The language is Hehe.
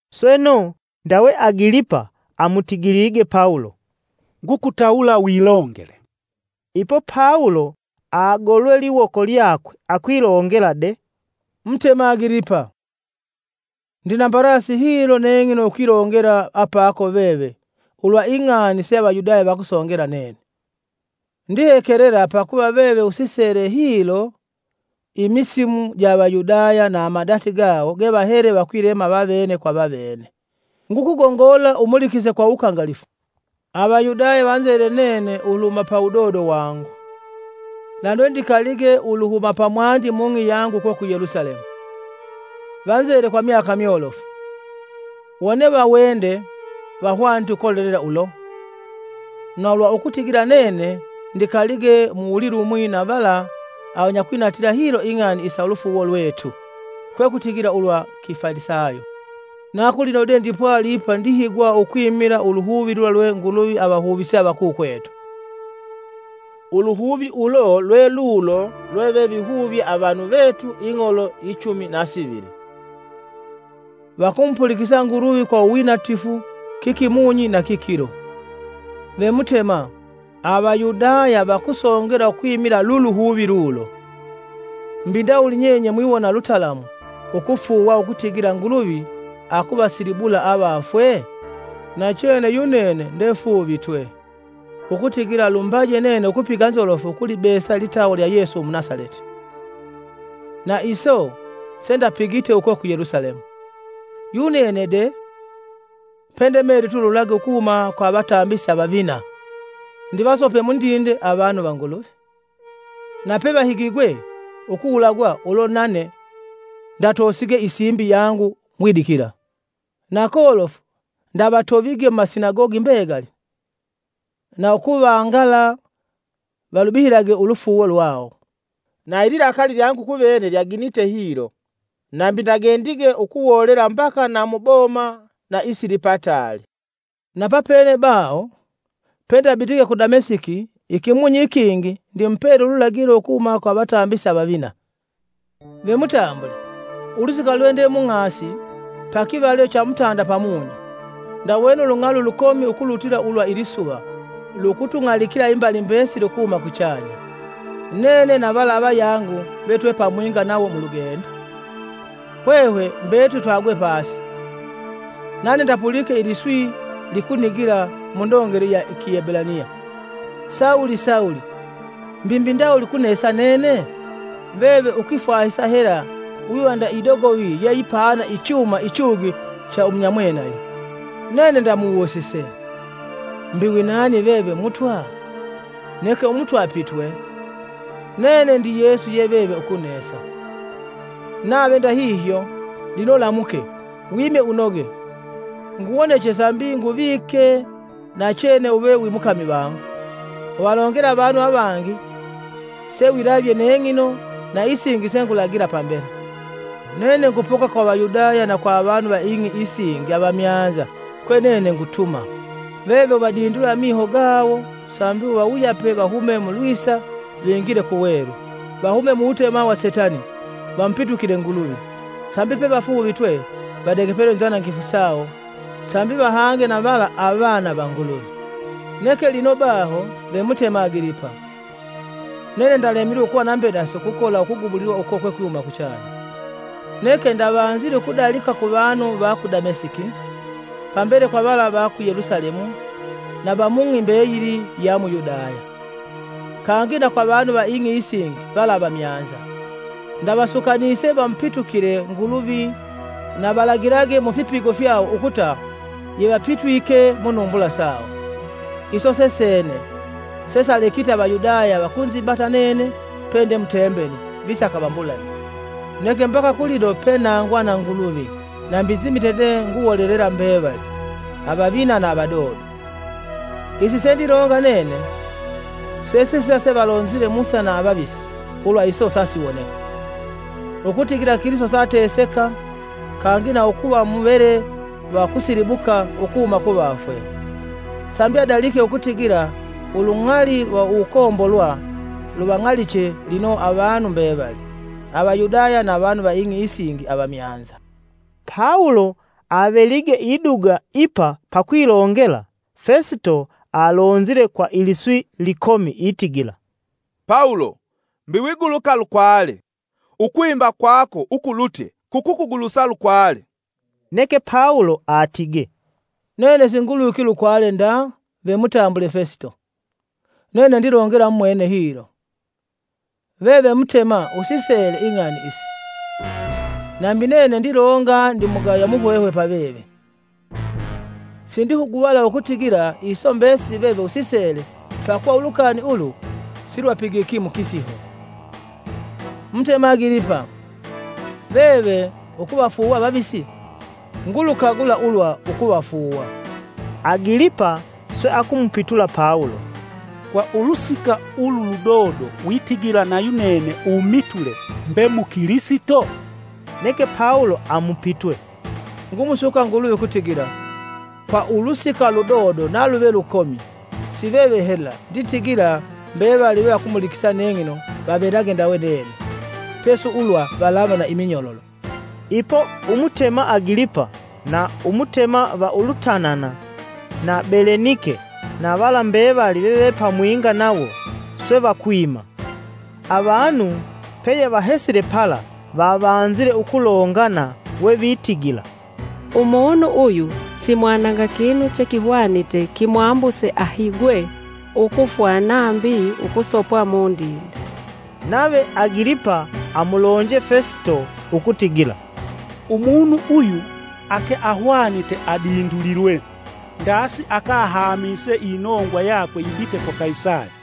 Sweno, ndawe Agilipa amutigilige Pawulo, “Ngukutawula wilongele.” Ipo Pawulo agolwe liwoko lyakwe akwilongela de: “Mutema Agilipa, ndina mbalasi hilo neng'ino ukwilongela apako veve ulwa ing'ani se Avayudaya vakusongela nene. Ndihekelela pakuva veve usisele hilo imisimu ja Avayudaya na amadati gawo gevahele vakwilema avene kwa avene, ngukugongola umulikise kwa wukangalifu. “Avayudaya vanzele nene uluhuma pa wudodo wangu, na lwendikalige uluhuma pamwandi mung'i yangu uko ku Yelusalemu. Vanzele kwa myaka myolofu, wone vawende, vahwanite ukolelela ulo, na ulwa ukutigila nene ndikalige mu uwulilumwi na vala avanyakwinatila hilo ing'ani isa ulufuuwo lwetu, kwekutigila ulwa Kifalisayo. Na kulino de ndipwali ipa ndihigwa ukwimila uluhuvi lula lwe Nguluvi avahuvise avakukwetu. Uluhuvi ulo lwelulo lwevevihuvye avanu vetu ing'olo ichumi na sivili, vakumupulikisa Nguluvi kwa uwinatifu kikimunyi nakikilo. Ve Mutema, Avayudaya vakusongela ukwimila luluhuvi lulo! Mbi ndawuli nyenye mwiwona lutalamu ukufuuwa ukutigila Nguluvi akuvasilibula avafwe? Nachene yunene ndefuuvitwe, ukutigila lumbaje nene ukupiga nzolofu ukulibesa litawa lya Yesu Umunasaleti. Na iso sendapigite uko ku Yelusalemu. Yunene de, pendemelitwe ululagi ukuhuma kwa avatambisi avavina, ndivasope mundinde avanu va Nguluvi. Na pevahigigwe ukuwulagwa ulo nane ndatosige isimbi yangu ngwidikila. Na kolofu ndavatovige mumasinagogi mbegali, na ukuvangala valubihilage ulufuuwo lwawo. Na ililakali lyangu kuvene lyaginite hilo, nambi ndagendige ukuwolela mbaka na mu boma na isilipataali. “Na papene baho, pendabitige ku Damesiki ikimunyi ikingi ndimupele ululagilo ukuhuma kwa avatambisi avavina. Ve mutambule, ulusika lwe nde mung'asi, pakivalilo cha mutanda pamunyi, ndawene ulung'ali ulukomi ukulutila ulwa ilisuva lukutung'alikila imbali mbesili ukuhuma kuchanya, nene na vala avayangu ve twepamwinga nawo mulugendo. Hwehwe mbetuli twagwe pasi, nane ndapulike iliswi likunigila mundongele ya i Kiebulaniya: ‘Sawulo, Sawulo! Mbi mbi ndawuli kunesa nene? Veve ukwifwahisa hela wiva nda idogovi yeyipaana ichuma ichugi cha umunyamwenayo.’ Nene ndamuwusise: ‘Mbi winani veve Mutwa?’ Neke Umutwa apitwe: ‘Nene ndi Yesu ye veve ukunesa. Nave ndahihyo, lino lamuke, wime unoge. Nguwoneche sambi nguvike nachene uve wimukami vangu. Uvalongela avanu avangi sewilavye neng'ino na isingi sengulagila pambele. Nene ngupoka kwa Avayudaya na kwa avanu va ing'i isingi avamyanza kwe nene ngutuma. Veve uvadindula amiho gawo sambi uvawuyape vahume mu lwisa vingile ku welu; vahume mu wutema wa Setani, vamupitukile Nguluvi, sambi pevafuuvitwe, vadegepelwe inzanangifu sawo sambi vahange na vala avana va Nguluvi.’ “Neke lino baho, ve Mutema Agilipa, nene ndalemilwe ukuva na mbedasi kwa ukugubulilwa uko kwekwihuma kuchanya. Neke ndavanzile ukudalika kuvanu va ku Damesiki, pambele kwa vala va ku Yelusalemu na va mung'i mbeyili ya mu Yudaya, kangi na kwa avanu va ing'i isingi vala avamyanza. Ndavasukanise vamupitukile Nguluvi na valagilage mu ifipigo fyawo ukuta yevapitwike munumbula sawo. Iso sesene, sesalekite Avayudaya vakunzibata nene pende mutembeli, visaka vambulage. Neke mbaka kulino pe nangwa na Nguluvi nambi nzimite de nguwolela mbevali, avavina na avadodo. Isi sendilonga nene sesisila se valonzile Musa na avavisi ulwa iso sasiwoneka; Ukutigila Kilisito saateseka kangi na ukuva muvele va kusilibuka ukuhuma kuvafwe, sambi adalike ukutigila ulung'ali lwa uwukombolwa luvang'aliche lino avanu mbevali, Avayudaya na avanu va ing'i isingi avamyanza.” Pawulo avelige iduga ipa pakwilongela, Festo alonzile kwa iliswi likomi itigila, “Pawulo! Mbi wiguluka lukwale! Ukwimba kwako ukulutye kukugulusa lukwale!” Neke Pawulo atige, “Nene singulwiki lukwale nda ve mutambule Fesito. Nene ndilongela mumwene hilo. Veve Mutema usisele ing'ani isi. Nambi nene ndilonga ndimugaya muhwehwe pa veve. Sindihuguvala ukutigila iso mbesili veve usisele pakuva ulukani ulu silwapigiki kwa kifiho. Mutema Agilipa, veve ukuvafuuwa avavisi? Ngulukagula ulwa ukuvafuuwa.” Agilipa swe akumupitula Pawulo, “Kwa ulusika ulu ludodo witigila nayunene umitule mbe mukilisito!” Neke Pawulo amupitwe, “Ngumusuka Nguluvi ukutigila, kwa ulusika ludodo naluve lukomi, si veve hela nditigila mbevali vevakumulikisa neng'ino vavelage ndawe nene, pesi ulwa valava na iminyololo.” Ipo Umutema Agilipa, na Umutema va Ulutanana, na Belenike na vala mbevali veve pamwinga nawo, swe vakwima. Avanu peyevahesile pala, vavanzile ukulongana we vitigila, “Umunu uyu simwananga kinu chekihwanite kimwambuse ahigwe ukufwa nambi ukusopwa mundinde.” Nave Agilipa amulonje Fesito ukutigila, “Umunu uyu ake ahwanite adindulilwe ndasi akahamise inongwa yakwe yibite kwa Kaisali.”